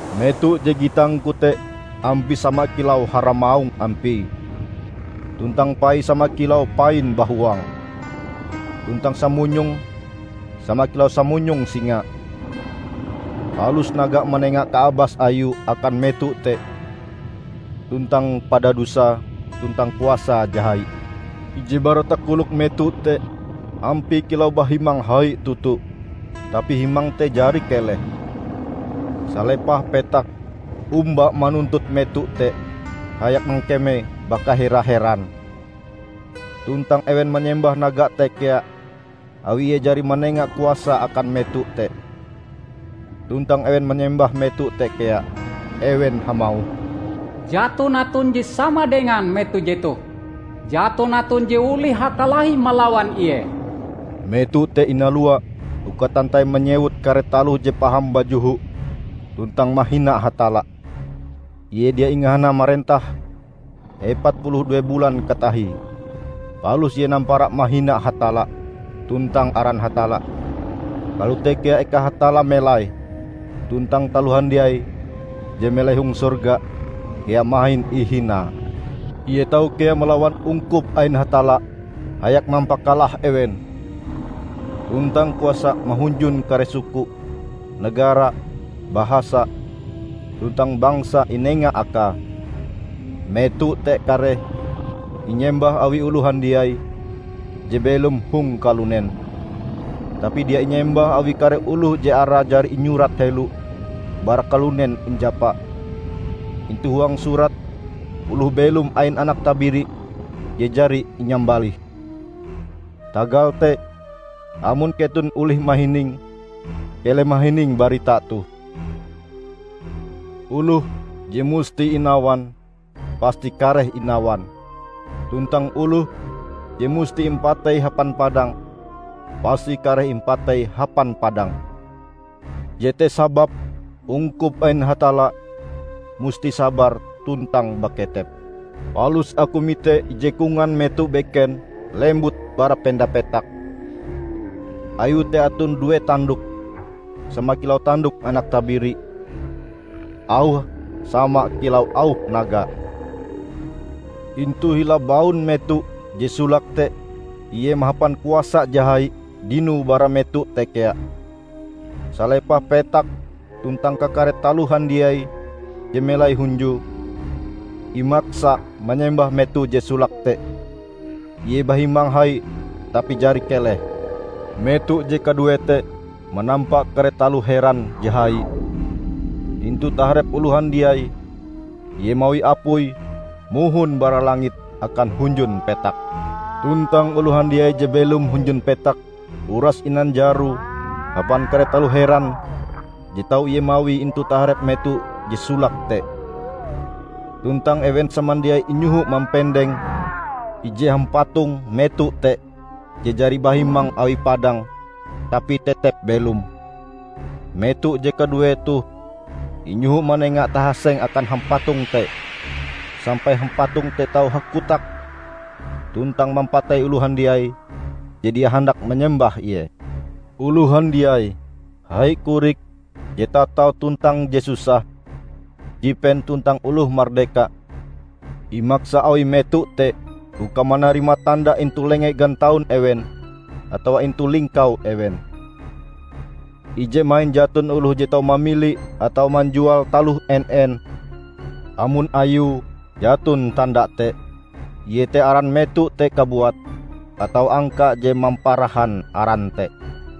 Meto je gitangku te ampie sama kilau haramaung ampie, tuntang paie sama kilau pain bahuang, tuntang samunyonge sama kilau samunyong singa. Palus naga manenga kaabas ayue akan meto te, tuntang padadusae, tuntang kuasae je hai. Ije bara takolok meto te ampie kilau bahimang hai toto, tapi himang te jari keleh. Salepah petak omba manuntut meto te hayak mangkeme bakahera-heran. Tuntang ewen manyembah naga te kea awi ie jari manenga kuasae akan meto te. Tuntang ewen manyembah meto te kea. Ewen hamauh, "Jaton aton je sama dengan meto jetoh! Jaton aton je olih hakalahi malawan ie!" Meto te inalua uka tantai manyewut kare taloh je paham bajoho tuntang mahina Hatalla, ie dia ingahana marentah epat puluh due bulan katahie. Palus ie nampara mahina Hatalla, tuntang aran Hatalla. Kalote kea eka Hatalla melai, tuntang taloh handiai je melai hong sorga kea mahin ihinae. Ie tau kea malawan ungkup ain Hatalla hayak mampakalah ewen. Tuntang kuasa mahunjun kare suku, negara, bahasa, tuntang bangsa inenga akae. Meto te kareh inyembah awi oloh handiai je belom hong kalunen, tapi dia inyembah awi kare oloh je arae jari inyurat helo bara kalunen injapa, intu huang surat oloh belom ain Anak Tabiri je jari inyambalih. Tagal te, amon keton olih mahining, keleh mahining barita toh: "Oloh je musti inawan, pasti kareh inawan. Tuntang oloh je musti impatei hapan padang, pasti kareh imapatei hapan padang. Jete sababe ungkup ain Hatalla musti sabar tuntang baketep." Palus aku mite ije kongan meto beken lembut bara penda petak. Ayue te aton due tandok sama kilau tandok anak tabiri. Auhe sama kilau auh naga. Intu hila baun meto je solake te ie mahapan kuasa je hai dinoe bara meto te kea. Salepah petak tuntang kakare taloh handiai je melai hunjue, imaksa manyembah meto je solake te, ie bahimang hai tapi jari keleh. Meto je kaduee te manampa kare taloh heran je hai. Intu taharep oloh handiai ie mawi apui mohon bara langit akan hunjun petak. Tuntang oloh handiai je belom hunjun petak uras inanjaroe hapan kare taloh heran je tau ie mawie intu taharep meto je solake te. Tuntang ewen samandiai inyohoe mampendeng ije hampatong meto te je jari bahimang awi padang, tapi tetep belom. Meto je kaduee toh inyoho manenga tahaseng akan hampatong te, sampai hampatong te tau hakotak tuntang mampatei oloh handiai je dia handak manyembah ie. Oloh handiai, hai korik, je tatau tuntang je susah, jipen tuntang oloh mardeka, imaksa awi meto te uka manarima tanda intu lenge gantaun ewen atawa intu lingkau ewen. Ije mahin jaton oloh je tau mamili atawa manjual taloh en-en, amon ayue jaton tanda te, iete aran meto te kabuat, atawa angka je mamparahan aran te.